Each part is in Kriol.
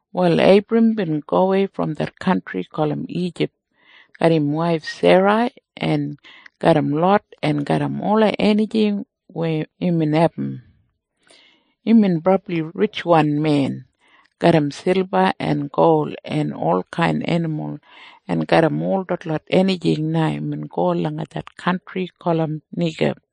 Wal Eibram bin gowei brom det kantri gulum Ijip garram im waif Serai en garram Lot en garram ola enijing weya imbin abum. Imbin brabli ritjwan men garram silba en gol en olkain enimul, en garram ol detlot enijing na imbin go langa det kantri gulum Neigib.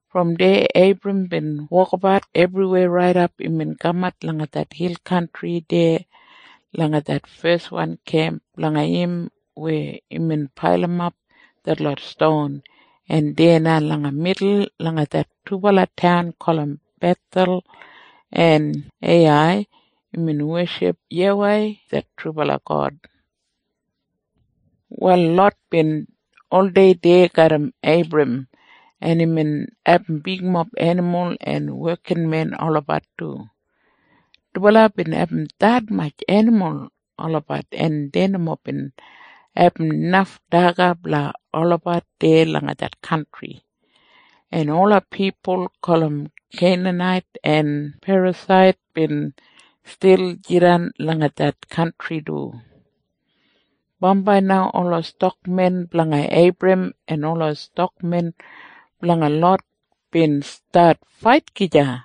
Brom deya Eibram bin wokabat ebriwei raidap imbin kamat langa det hil kantri deya langa det feswan kemp blanga im weya imbin pailimap detlot ston, en deya na langa midul langa det dubala taun gulum Bethel en Eiyai imbin weship YAWEI det trubala God. Wal Lot bin oldei deya garram Eibram, en imbin abum bigmob enimul en wekinmen olabat du. Dubala bin abum detmatj enimul olabat, en dei nomo bin abum naf daga blanga olabat deya langa det kantri. En ola pipul gulum Keinanait en Perasait bin stil jidan langa det kantri du. Bambai na ola stakmen blanga Eibram en ola stakmen blanga Lot bin stat fait gija,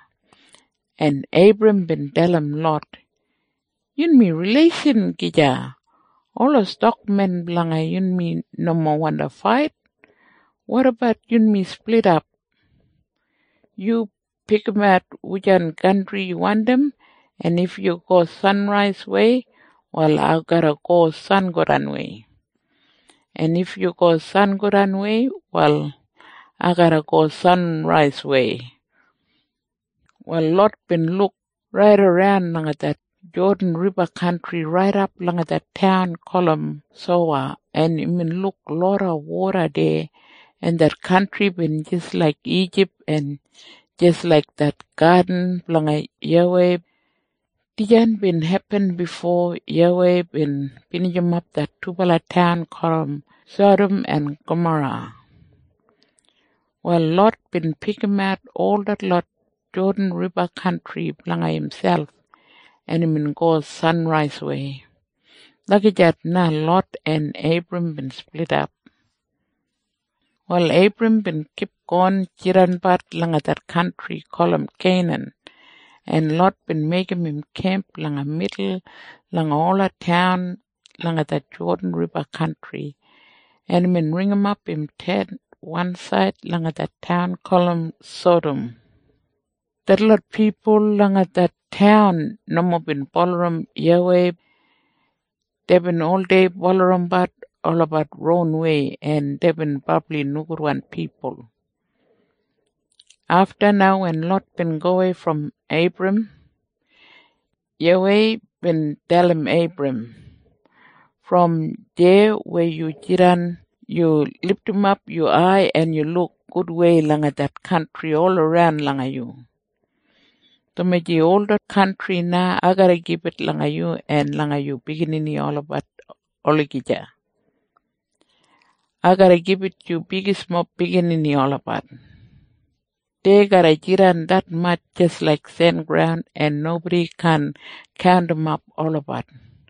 en Eibram bin dalim Lot, “Yunmi rileishan gija. Ola stakmen blanga yunmi nomo wandi fait. Wotabat yunmi splidap? Yu pikimat wujan kantri yu wandim, en if yu go sanraiswei, wal ai garra go sangodanwei. En if yu go sangodanwei, wal ai garra go sanraiswei.” Wal Lot bin luk raidaran langa det Jodan Riba kantri raidap langa det taun gulum Sowa, en imbin luk loda woda deya, en det kantri bin jis laik Ijip en jis laik det gadin blanga YAWEI. Dijan bin hepin bifo YAWEI bin binijimap det dubala taun gulum Sadam en Gamora. Wal Lot bin pikimat ol detlot Jodan Riba kantri blanga imselp, en imbin go sanraiswei. Lagijat na Lot en Eibram bin splidap. Wal Eibram bin kipgon jidanbat langa det kantri gulum Keinan, en Lot bin meigim im kemp langa midul langa ola taun langa det Jodan Riba kantri, en imbin ringimap im tent wansaid langa det taun gulum Sadam. Detlot pipul deya langa det taun nomo bin bulurrum YAWEI. Deibin oldei bulurrumbat olabat ronwei, en deibin brabli nogudwan pipul. Afta na wen Lot bin gowei brom Eibram, YAWEI bin dalim Eibram, “Brom deya weya yu jidan yu lidimap yu ai, en yu luk gudwei langa det kantri olaran langa yu, dumaji ol det kantri na ai garra gibit langa yu en langa yu biginini olabat olagija. Ai garra gibit yu bigismob biginini olabat. Dei garra jidan detmatj jis laik sengraun, en nobodi kaan kaundimap olabat.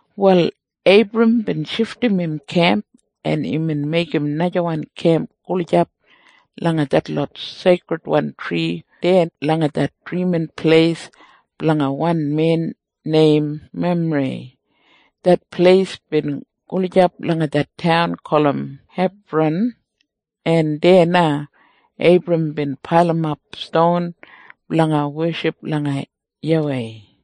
Wal Eibram bin shifdim im kemp, en imbin meigim najawan kemp gulijap langa detlot seikridwan tri deya langa det drimin pleis blanga wan men neim Memrei. Det pleis bin gulijap langa det taun gulum Hebran, en deya na Eibram bin pailimap ston blanga weship langa YAWEI.